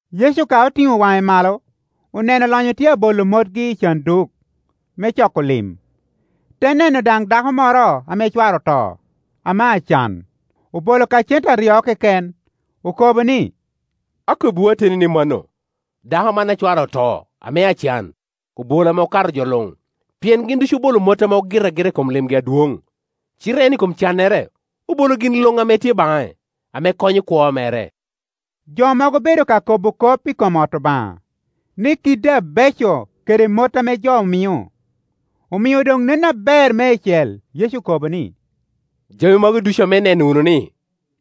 Yecu ka otiŋo waŋe malo, oneno olonyo tye abolo motgi i canduk me coko lim. Te neno daŋ dako moro ame cware oto, ame acan, obolo ka cente aryo keken. Okobo ni, “Akobbiwu ateni ni mano, dako man a cware oto, ame acan, obolo ame okato jo luŋ. Pien gin ducu obolo mot ame gin ogito agita i kom limgi adwoŋ, cite en i kom cannere obolo gin luŋ ame tye baŋe, ame konyo kwo mere.” Jo mogo obedo ka kobo kop i kom ot Obaŋa, ni kiddi abeco, kede mot ame jo omio, omio doŋ nen aber meicel. Yecu okobo ni, “Jami magi ducu ame ineno wunu-ni,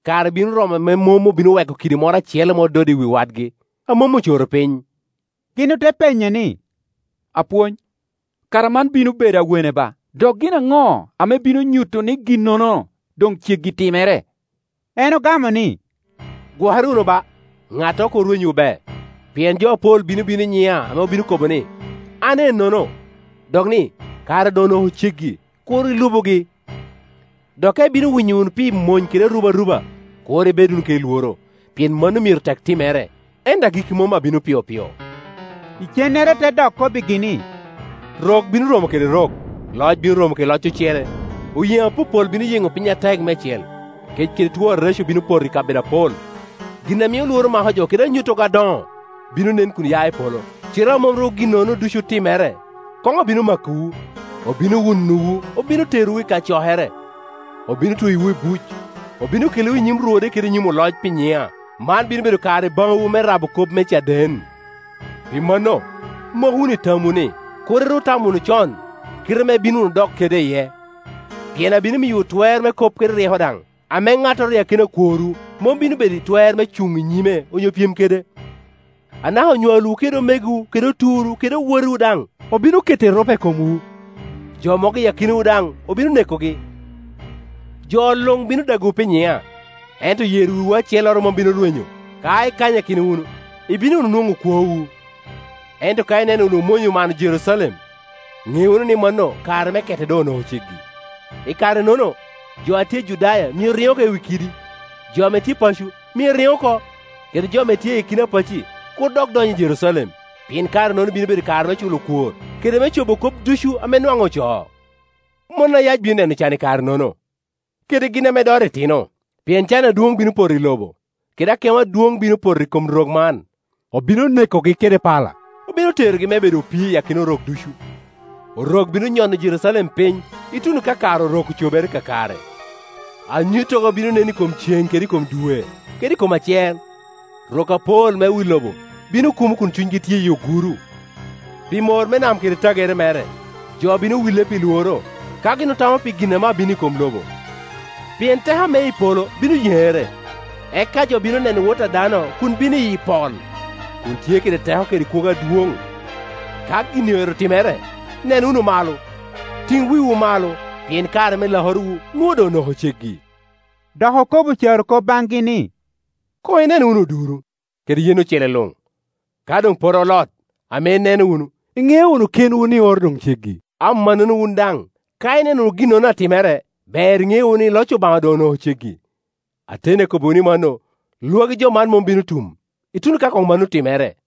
kare bino romo ame mom obino weko kidi moro acel ame ododde i wi wadgi, a mom ocoro piny.” Gin ote penye ni, “Apwony, kara man bino bedo awene ba? Dok gin aŋo ame bino nyuto ni ginnono doŋ ceggi timere?” En ogamo ni, “Gwokere wunu ba, ŋattoro kur rwenywu be; pien jo apol bino bino i nyiŋa ame obino kobo ni, ‘An ennono,’ dok ni, ‘Kare doŋ onoko ceggi!’ Kur ilubugi. Dok ka ibino winyo wunu pi mony kede arubaruba, kur ibed wunu kede lworo, pien mano myero tek timere, ento agikki mom abino piopio.” Icennere te dok kobbigi ni, “Rok bino romo kede rok, loc bino romo kede loc ocele. Oyeŋo apopol bino yeŋo piny atek meicel, kec kede two areco bino poto i kabedo apol. Gin a mio lworo mako jo, kede anyuttogo adoŋo, bino nen kun ya i polo. Cite a mom ru ginnono ducu otimere, koŋ obino makowu, obino wunowu, obino terowu i kacokere, obino tweyowu i buc, obino kelowu i nyim rwode kede i nyim oloc pi nyiŋa. Man bino bedo kare baŋwu me rabo kop me caden. Pi mano, mok wunu i tamwu ni, kur iru tamo wunu con kite ame ibino wunu dok kede iye, pien abino miyowu twer me kop, kede ryeko daŋ, ame ŋattoro i akina okworwu mom bino bedo i twer me cuŋ i nyime onyo pyem kede. Anaka onywalwu kede omegowu kede oturwu kede owotewu daŋ obino keto erupe i komwu, jo mogo i akinawu daŋ obino nekogi. Jo luŋ bino dagowu pi nyiŋa. Ento yer wiwu acelloro mom bino rwenyo. Ka ikanyakino wunu, ibino wunu nwoŋo kwowu. “Ento ka ineno wunu mony omano Jerucalem, ŋe wunu ni mano, kare me kete doŋ onoko ceggi. I karenono, jo a tye i Judaya myero riŋ oko i wi kiddi, jo ame tye paco myero riŋ oko, kede jo ame tye i akina pacci kur dok dony i Jerucalem; pien kare-nono bino bedo kare me culo kwor, kede me cobo kop ducu ame nwaŋ ocoo. Mon a yac bino neno can i kare-nono, kede gin ame doto itino! Pien can adwoŋ bino poto i lobo, kede akemo adwoŋ bino poto i kom rok man. Obino nekogi kede pala, obino terogi me bedo opii i akina rok ducu, Orok bino nyono Jerucalem piny, ituno ka kare Orok ocobere kakare. “Anyuttogo bino nen i kom cen kede i kom dwe kede i kom acer, rok apol me wi lobo bino kumo kun cunygi tye i oguro, pi mor me nam kede tagere mere. Jo bino wille pi lworo, ka gin otamo pi gin ame abino i kom lobo; pien teko ame i polo bino yeŋere. Eka jo bino neno Wot a dano kun bino iyi pol, kun tye kede teko kede kwogo adwoŋ. Ka gin-ni oero timere, nen wunu malo, tiŋ wiwu malo, pien kare me lakorowu nwoŋo doŋ onoko ceggi.” Dok okobo carokop baŋgi ni, “Koŋ inen wunu oduro, kede yen ocele luŋ. Ka doŋ pote olot, ame ineno wunu, iŋeo wunu kenwu ni oro doŋ ceggi. Amannono wun daŋ, ka ineno ginnono atimere, ber iŋe wunu ni, loc Obaŋa doŋ onoko ceggi. Ateni akobbiwu ni mano, lwagi jo man mom bino tum, ituno ka koŋ mannono otimere.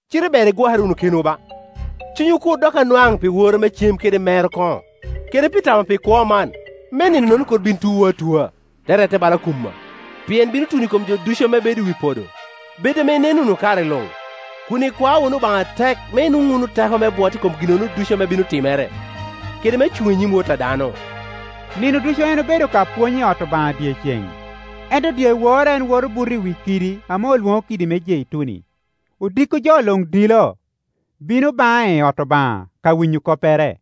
“Cite ber igwokere wunu kenwu ba, cunywu kur dok anwaŋ pi woro me cem kede mero koŋo, kede pi tamo pi kwo man, me nino-nono kur bin tuwu atua, te rette bala kumma; pien bino tuno i kom jo ducu ame bedo i wi podo. Bed ame ineno wunu kare luŋ, kun ikwao wunu Obaŋa atek me inwoŋu teko me bwot i kom ginnono ducu ame bino timere, kede me cuŋ i nyim Wot a dano.” Nino ducu en obedo ka pwony i ot Obaŋa dyeceŋ, ento dyewor en woto buta i wi kidi ame olwoŋo kidi me Jeituni. Odiko jo luŋ dilo, bino baŋe i ot Obaŋa ka winyo koppere.